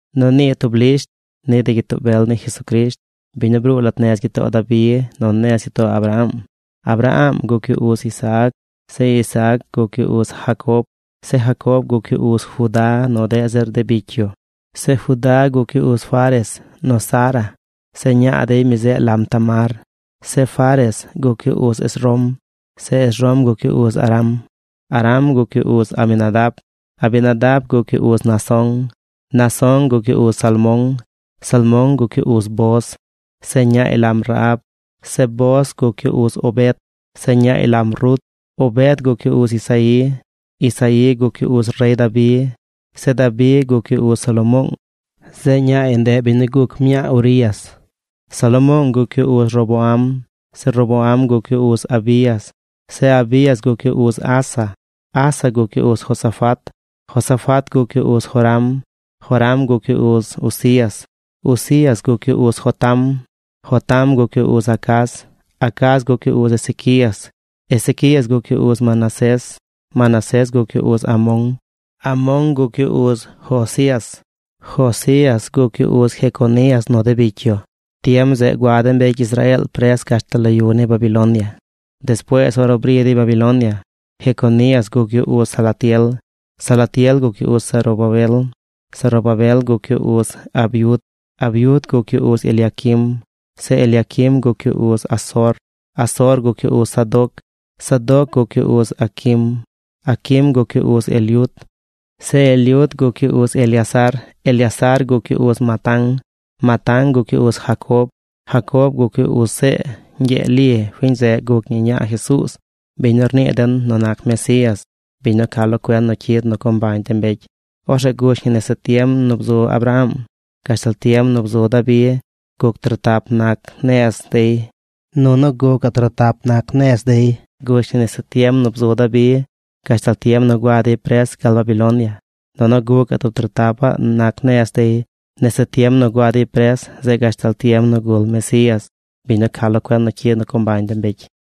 Nu nii tub lisht ni de gyitoo bel ni Jesucrisht, biñ nu bruu lat nez gyitoo Dabi nu nez gyitoo Abraham. Abraham guc yu uz Isaac. Zeꞌ Isaac guc yu uz Jacob. Zeꞌ Jacob guc yu uz Judá nu deꞌ zir de bicy yu. Zeꞌ Judá guc yu uz Fares nu Zara. Zeꞌ ñaa dey, mi zeꞌ lam Tamar. Zeꞌ Fares guc yu uz Esrom. Zeꞌ Esrom guc yu uz Aram. Aram guc yu uz Aminadab. Aminadab guc yu uz Naasón. Naasón guc yu uz Salmón. Salmón guc yu uz Booz. Zeꞌ ñaay lam Rahab. Zeꞌ Booz guc yu uz Obed. Zeꞌ ñaay lam Rut. Obed guc yu uz Isaí. Isaí guc yu uz rey Dabi. Zeꞌ Dabi guc yu uz Salomoong. Zeꞌ ñaay, ndeꞌ biñ nu guc mñaa Urías. Salomoong guc yu uz Roboam. Zeꞌ Roboam guc yu uz Abías. Zeꞌ Abías guc yu uz Asa. Asa guc yu uz Josafat. Josafat guc yu uz Joram. Joram guc yu uz Uzías. Uzías guc yu uz Jotam. Jotam guc yu uz Acaz. Acaz guc yu uz Ezequías. Ezequías guc yu uz Manasés. Manasés guc yu uz Amón. Amón guc yu uz Josías. Josías guc yu uz Jeconías nu de bicy yu. Tiem zeꞌ gua de mbecy Israeel pres gashtal lo yu ni Babilonia. Despuees ornu bri dey Babilonia, Jeconías guc yu uz Salatiel. Salatiel guc yu uz Zorobabel. Zorobabel guc yu uz Abiud. Abiud guc yu uz Eliaquim. Zeꞌ Eliaquim guc yu uz Azor. Azor guc yu uz Sadoc. Sadoc guc yu uz Aquim. Aquim guc yu uz Eliud. Zeꞌ Eliud guc yu uz Eleazar. Eleazar guc yu uz Matán. Matán guc yu uz Jacob. Jacob guc yu uz See ñgyee Li. Fiñ zeꞌ guc ñi ñaa Jesuuz, biñ nu rnii den nu nac Mesías, biñ nu ca lo cuen nu cyid nu co mbañ de mbecy. Orzeꞌ gush ñi nese tiem nu bzu Abraham gashtal tiem nu bzu Dabi guc trotap nac nez dey. Nunu gucaꞌ trotap nac nez dey, gush ñi nese tiem nu bzu Dabi gashtal tiem nu gua dey pres gal Babilonia. Nunu gucaꞌ tub trotapaꞌ nac nez dey nese tiem nu gua dey pres zeꞌ gashtal tiem nu gul Mesías, biñ nu ca lo cuen nu cyid nu co mbañ de mbecy.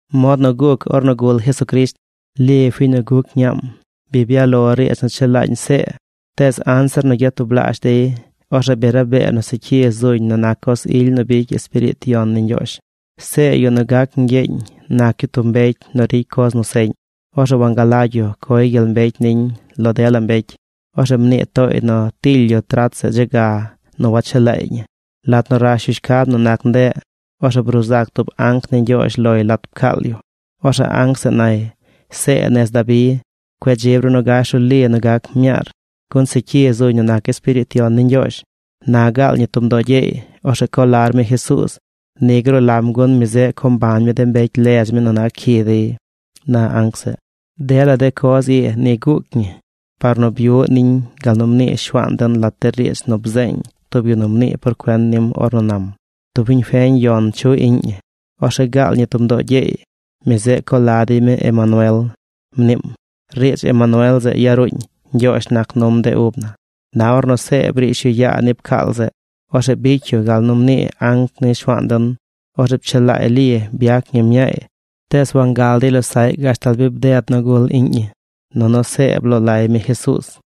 Mod nu guc ornu gul Jesucrisht. Li, fiñ nu guc ñaam, bi byaꞌ lo riidz nu chelaañ See, tees anzir nu gyatublaazh dey, orzeꞌ bi rabee nu secyi zuñ nu nac coz ily nu bicy Espiriit Yon ni Ñgyoozh. See, yu nu gac ñgyeeñ nac yu tub mbecy nu ricy coz nu seꞌñ. Orzeꞌ wangalagy yu coy gyel mbecy niñ lo dela mbecy. Orzeꞌ mnii tooy nu tily yu trat zeꞌ dze ga nu wachelaay ñi. Lat nu rash yu shcab nu nac ndeꞌ, orzeꞌ bruu zac tub anc ni Ñgyoozh loy lat pcaal yu. Orzeꞌ anc zeꞌ nay: ―See nez Dabi, cueꞌ dzib ru nu gash ru Li nu gac mñaar, gun secyi zuñ nu nac Espiriit Yon ni Ñgyoozh. Na gaal ñi tub mdoo gyeey. Orzeꞌ co lar mi Jesuuz. Ni gruu lam gun mi zeꞌ co mbañ mi de mbecy ledz mi nu nac cyi dey ―na anc zeꞌ. Dela de coz ii ni guuc ñi par nu byuꞌ niñ gal nu mnii Shuaan den lat de riidz nu bzeeñ tub yu nu mnii por cuen nim ornu nam: Tub fiñ feñ yon chuꞌ iꞌñ ñi. Orzeꞌ gaal ñi tub mdoo gyeey. Mi zeꞌ co la dey mi Emanuel, mniim. (Riidz Emanuel zeꞌ yaruuñ: Ñgyoozh nac num de ub naa.) Na ornu See briish yu yaa ni pcaal zeꞌ, orzeꞌ bicy yu gal nu mnii anc ni Shuaan den. Orzeꞌ pchelaay Li. Byac ñi mñaay. Tees wangal dey losaꞌy gashtal bi bded nu gul iꞌñ ñi. Nunu See bloo lay mi Jesuuz.